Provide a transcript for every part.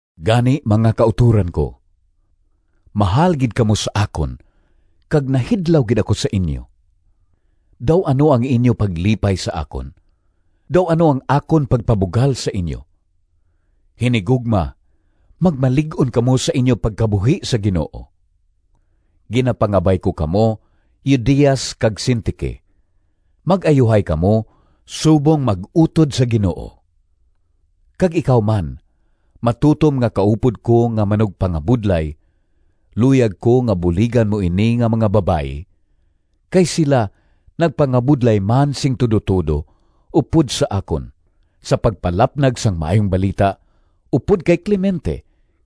Gani, mga kautoran ko—mahal gid kamo sa akon kag nahidlaw gid ako sa inyo! Daw ano ang inyo paglipay sa akon, daw ano ang akon pagpabugal sa inyo!—hinigugma, magmalig-on kamo sa inyo pagkabuhi sa Ginoo. Ginapangabay ko kamo, Eudias kag Sintique, mag-ayuhay kamo subong mag-utod sa Ginoo. Kag ikaw man, matutom nga kaupod ko nga manugpangabudlay, luyag ko nga buligan mo ini nga mga babayi, kay sila nagpangabudlay man sing tudotudo upod sa akon sa pagpalapnag sang Maayong Balita, upod kay Clemente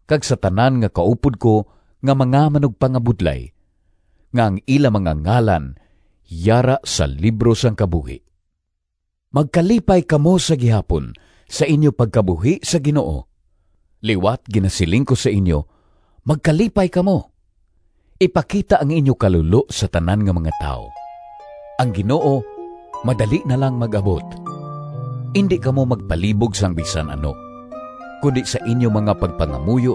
kag sa tanan nga kaupod ko nga mga manugpangabudlay, nga ang ila mga ngalan yara sa libro sang kabuhi. Magkalipay kamo sa gihapon sa inyo pagkabuhi sa Ginoo. Liwat ginasiling ko sa inyo, magkalipay kamo! Ipakita ang inyo kalulo sa tanan nga mga tawo. Ang Ginoo madali na lang mag-abot. Indi kamo magpalibog sang bisan ano, kundi sa inyo mga pagpangamuyo,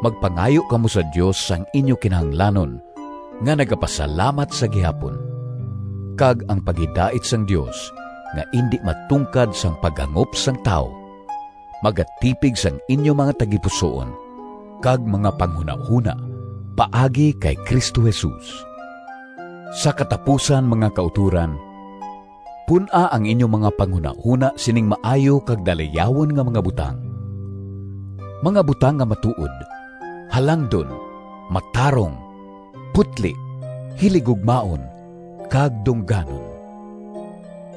magpangayo kamo sa Dios sang inyo kinahanglanon nga nagapasalamat sa gihapon. Kag ang paghidait sang Dios nga indi matungkad sang paghangop sang tawo, magatipig sang inyo mga tagipusoon kag mga panghunahona paagi kay Cristo Jesus. Sa katapusan, mga kautoran, pun-a ang inyo mga panghunahona sining maayo kag dalayawon nga mga butang: mga butang nga matuod, halangdon, matarong, putli, hiligugmaon, kag dungganon.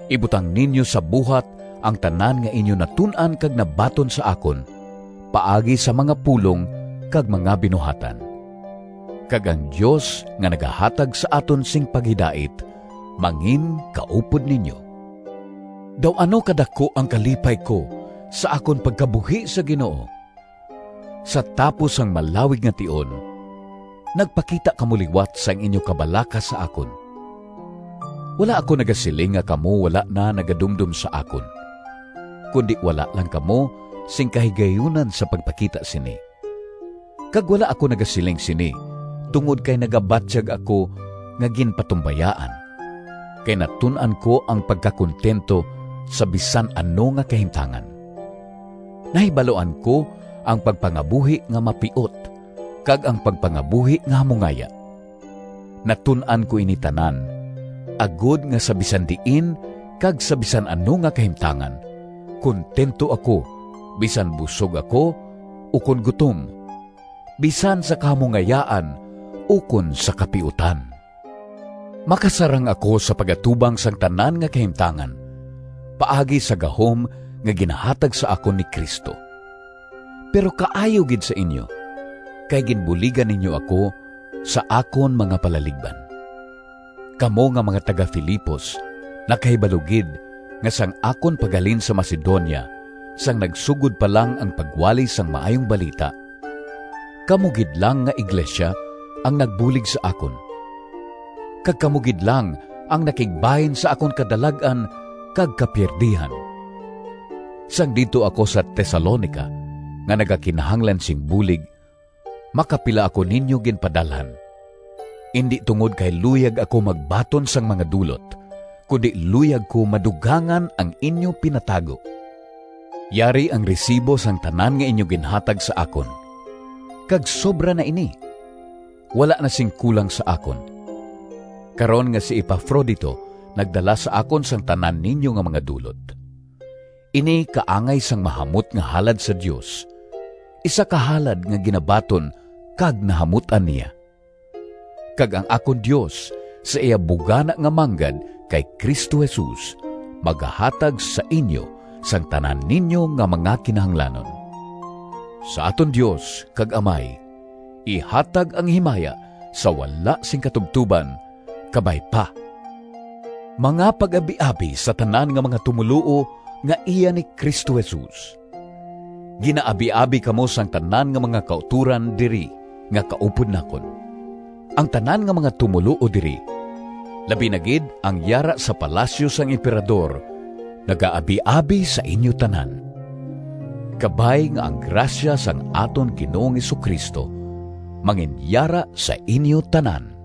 Ibutang ninyo sa buhat ang tanan nga inyo natun-an kag nabaton sa akon paagi sa mga pulong kag mga binuhatan. Kag ang Dios nga nagahatag sa aton sing paghidait manginkaupod ninyo. Daw ano kadaku ang kalipay ko sa akon pagkabuhi sa Ginoo! Sa tapos sang malawig nga tion, nagpakita kamo liwat sang inyo kabalaka sa akon. Wala ako nagasiling nga kamo wala na nagadumdom sa akon, kundi wala lang kamo sing kahigayunan sa pagpakita sini. Kag wala ako nagasiling sini tungod kay nagabatyag ako nga ginpatumbayaan, kay natun-an ko ang pagkakuntento sa bisan ano nga kahimtangan. Nahibaluan ko ang pagpangabuhi nga mapiot kag ang pagpangabuhi nga hamungaya. Natun-an ko ini tanan, agod nga sa bisan diin kag sa bisan ano nga kahimtangan kuntento ako bisan busog ako ukon gutom, bisan sa kahamungayaan ukon sa kapiutan. Makasarang ako sa pag-atubang sang tanan nga kahimtangan paagi sa gahom nga ginahatag sa akon ni Cristo. Pero kaayo gid sa inyo, kay ginbuligan ninyo ako sa akon mga palaligban. Kamo nga mga taga-Filipos nakahibalo gid nga sang akon paghalin sa Macedonia sang nagasugod pa lang ang pagwali sang Maayong Balita, kamo gid lang nga iglesia ang nagbulig sa akon, kag kamo gid lang ang nakigbahin sa akon kadalag-an kag kapiyerdihan. Sang didto ako sa Tesalonica nga nagakinahanglan sing bulig, makapila ako ninyo ginpadalhan. Indi tungod kay luyag ako magbaton sang mga dulot, kundi luyag ko madugangan ang inyo pinatago. Yari ang resibo sang tanan nga inyo ginhatag sa akon, kag sobra na ini! Wala na sing kulang sa akon, karon nga si Epafrodito nagdala sa akon sang tanan ninyo nga mga dulot. Ini kaangay sang mahamot nga halad sa Dios, isa ka halad nga ginabaton kag nahamut-an niya. Kag ang akon Dios, sa iya bugana nga manggad kay Cristo Jesus magahatag sa inyo sang tanan ninyo nga mga kinahanglanon. Sa aton Dios kag Amay ihatag ang himaya sa wala sing katubtoban. Kabay pa. Mga pag-abiabi sa tanan nga mga tumoluo nga iya ni Cristo Jesus. Ginaabiabi kamo sang tanan nga mga kautoran diri nga kaupod nakon. Ang tanan nga mga tumoluo diri, labi na gid ang yara sa palasyo sang Emperador nagaabiabi sa inyo tanan. Kabay nga ang grasya sang aton Ginoong Jesu-Cristo manginyara sa inyo tanan.